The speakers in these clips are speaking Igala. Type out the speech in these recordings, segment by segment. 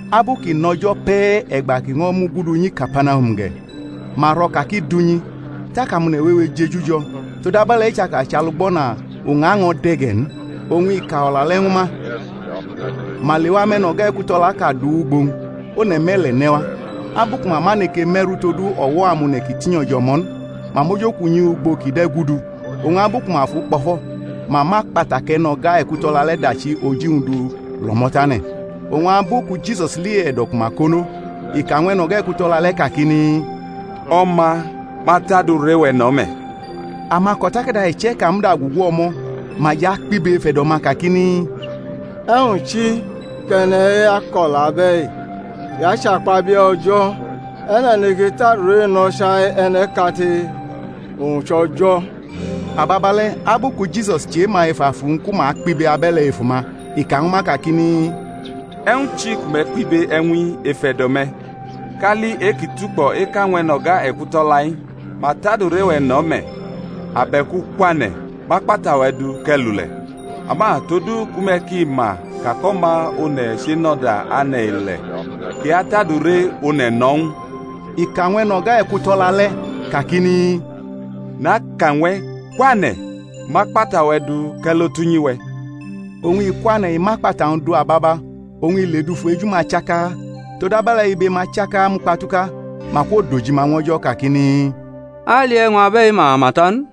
Abu kʼi nʼo̩jo̩ pe̩ e̩gba kʼi ño̩ mugudu nyi Kapanahum ge̩, ma ro̩ ka kʼi dʼunyi. Tak amone̩ wewe jeju jo̩, todabe̩le̩ i chaka chʼalugbo̩na, uña ño̩ de̩ ge̩ n; oñ i ka o̩la le̩ ñwu ma. Ma lewa mʼe̩no̩ga ekuto̩laʼka du wʼugbo-wñ, one̩ me̩le̩ ne̩ wa. Abu ku ma ma neke me̩rʼu todu o̩wo̩ amone̩ ki tinyo̩ jʼo̩mo̩ n, ma mʼojokunyi ugbo kʼi de̩ gudu; oñ abu ku ma fʼu kpo̩fo̩, ma mʼakpata kʼe̩no̩ga ekuto̩la le̩ dachi oji-wñ du lʼo̩mo̩ tane̩. Oñ abu ku Jisus li e̩do̩ ku ma konʼo, i ka ñw e̩no̩ga ekuto̩la le̩ kakini, O̩ma, ma tʼadure-we̩ no̩ me̩. Amako̩takada iche̩ka muda gugu o̩mo̩, ma jʼakpibe ef e̩do̩-ma kakini, E̩wñ chi kʼe̩ne̩-i ako̩la abe̩i? I achakpabie̩ O̩jo̩. E̩ne̩ neke tʼadure no̩ chai e̩ne̩ʼkate? owñ chʼO̩jo̩. Ababale̩ abu ku Jisus chema ef afu-wñ ku ma kpibe abe̩le̩ ef uma, i ka ñwu ma, kakini, E̩wñ chi ku me̩ kpibe e̩wñ-i ef e̩do̩-me̩? Kali e-ki tukpo̩ eka ñw e̩no̩ga ekuto̩la-i, Ma tʼadure-we̩ no̩ me̩; abe̩ku Kwane̩, mʼakpata-we̩ du kʼe̩ lule̩? Ama todu ku me̩ ki ma ka kʼO̩ma One̩ chenʼo̩da ane̩ ile̩ kʼi atʼadure one̩ no̩ ñw u, (i ka ñw e̩no̩ga ekuto̩la le̩) kakini, Naka ñw e̩, kwane̩, mʼakpata-we̩ du kʼe̩ lo tʼunyi we̩. Oñ i kwane̩, i mʼakpata-wñ du ababa, oñ i ledufu eju-ma chaka; todabe̩le̩ ibe-ma chaka mukpatuka, ma kwodojima ñw O̩jo̩ kakini, A li e̩wñ abe̩i mama ta n.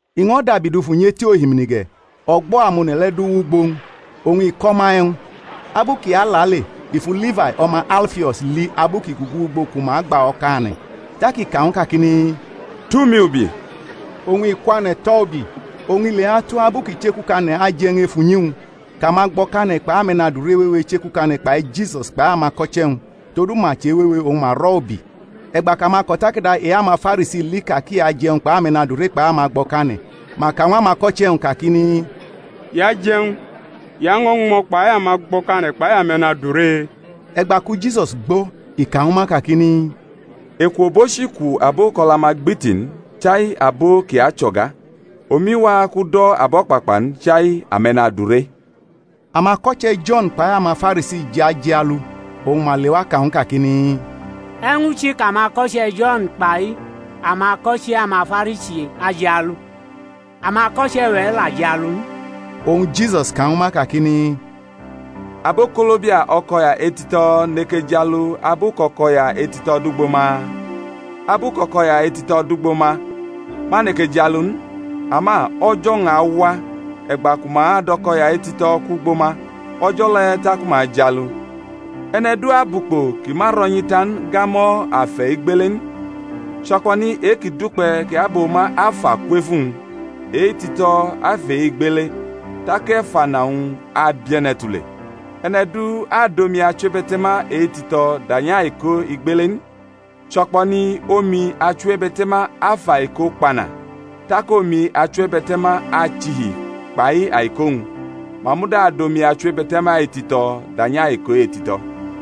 I ño̩ dabi dufu nyʼeti ohimini ge̩, o̩gbo̩ amone̩ le̩ du wʼugbo-wñ, oñ i ko̩ ma e̩wñ. Abu kʼi alale, i fu Lifai o̩ma Alfio̩s li abu kʼi gugu ugbo ku ma gba o̩kane̩. Tak i ka ñw u, kakini, Tʼumi ubi. Oñ i kwane̩ tʼo̩ ubi. Oñ ileatu abu kʼi chekukane̩ aje̩-wñ ef unyi-wñ, kʼamagbo̩kane̩ kpai ame̩nadure wewe chekukane̩ kpai Jisus kpai amako̩che̩-wñ; todu ma che̩wewe, oñ ma rʼo̩ ubi. E̩gba kʼamako̩takada e-amaFarisi li ka kʼi aje̩wñ kpai ame̩nadure kpai amagbo̩kane̩, ma ka ñw amako̩che̩-wñ kakini, I ajʼe̩wñ, i año̩ ñmo̩ kpai amagbo̩kane̩ kpai ame̩nadure? E̩gba ku Jisus gbo̩ i ka ñwu ma kakini, Eku obochi ku abo kʼo̩la-ma gbiti n, chai abo ki acho̩ga. Omi wa kʼu do̩ abo̩kpakpa n, chai ame̩nadure. Amako̩che̩ Jo̩n kpai amaFarisi jʼajialu; oñ ma lewa ka ñw u kakini, E̩wñ chi kʼamako̩che̩ Jo̩n kpai amako̩che̩ amaFarisi ajialu, amako̩che̩-we̩ la jialu n? Oñ Jisus ka ñwu ma kakini, Abokolobia o̩ko̩ya etito̩ neke jialu abu kʼo̩ko̩ya etito̩ dʼugbo ma? Abu kʼo̩ko̩ya etito̩ dʼugbo ma, ma neke jialu n. Ama o̩jo̩-wñ awa, e̩gba ku ma adʼo̩ko̩ya etito̩ kwʼugbo ma, o̩jo̩ le̩ taku ma ajialu. E̩ne̩ du abʼukpo ki ma ro̩nyi ta n gamo̩ afe̩ igbele n; cho̩kpo̩ni e-kʼi dukpe̩ kʼi aboma afa kwʼef uwñ, e-etito̩ afʼe-igbele, tak efana-wñ abie̩ne̩ tule. E̩ne̩ du adʼomi achiwebe̩te̩ma etito̩ danyʼaiko igbele n; cho̩kpo̩ni omi achiwebe̩te̩ma afʼaiko kpana, tak omi achiwebe̩te̩ma achihi kpai aiko-wñ; ma muda adʼomi achiwebe̩te̩ma etito̩ danyʼaiko etito̩.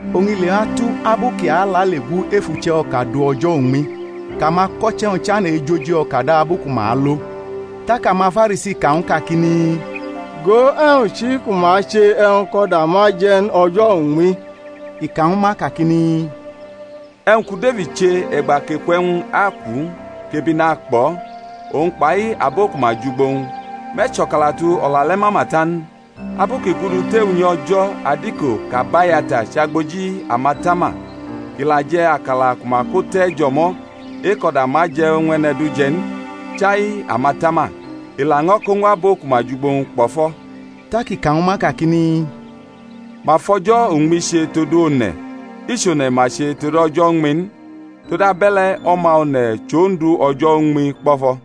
Oñ ileatu abu kʼi alale gu ef uche̩-o̩ka du o̩jo̩ uñmi, kʼamako̩che̩-wñ chane̩ ejʼoji o̩ka da abu ku ma alo. Tak amaFarisi ka ñw u kakini, Go, e̩wñ chi ku ma che e̩wñ kʼo̩da ma je̩ n o̩jo̩ uñmi? I ka ñwu ma, kakini, E̩wñ ku Defid che e̩gba kʼeku e̩wñ akʼu, kʼebi nakpʼo̩, uwñ kpai abo ku ma jʼugbo-wñ, me̩ cho̩kalatu o̩la le̩ mama ta n? Abu kʼi gudu tef unyi O̩jo̩ adiko kʼAbayata chʼagboji amatama kʼi la je̩ akala ku ma ko te̩ jʼo̩mo̩ e-kʼo̩da ma je̩ ñw e̩ne̩ du je̩ n, chai amatama, i laño̩ ko ñw abo ku ma jʼugbo-wñ kpo̩fo̩. Tak i ka ñwu ma, kakini, Ma fʼo̩jo̩ uñmi che todu one̩, i chʼone̩ ma che tod o̩jo̩ uñmi n; todabe̩le̩ O̩ma One̩ chʼOndu o̩jo̩ uñmi kpo̩fo̩.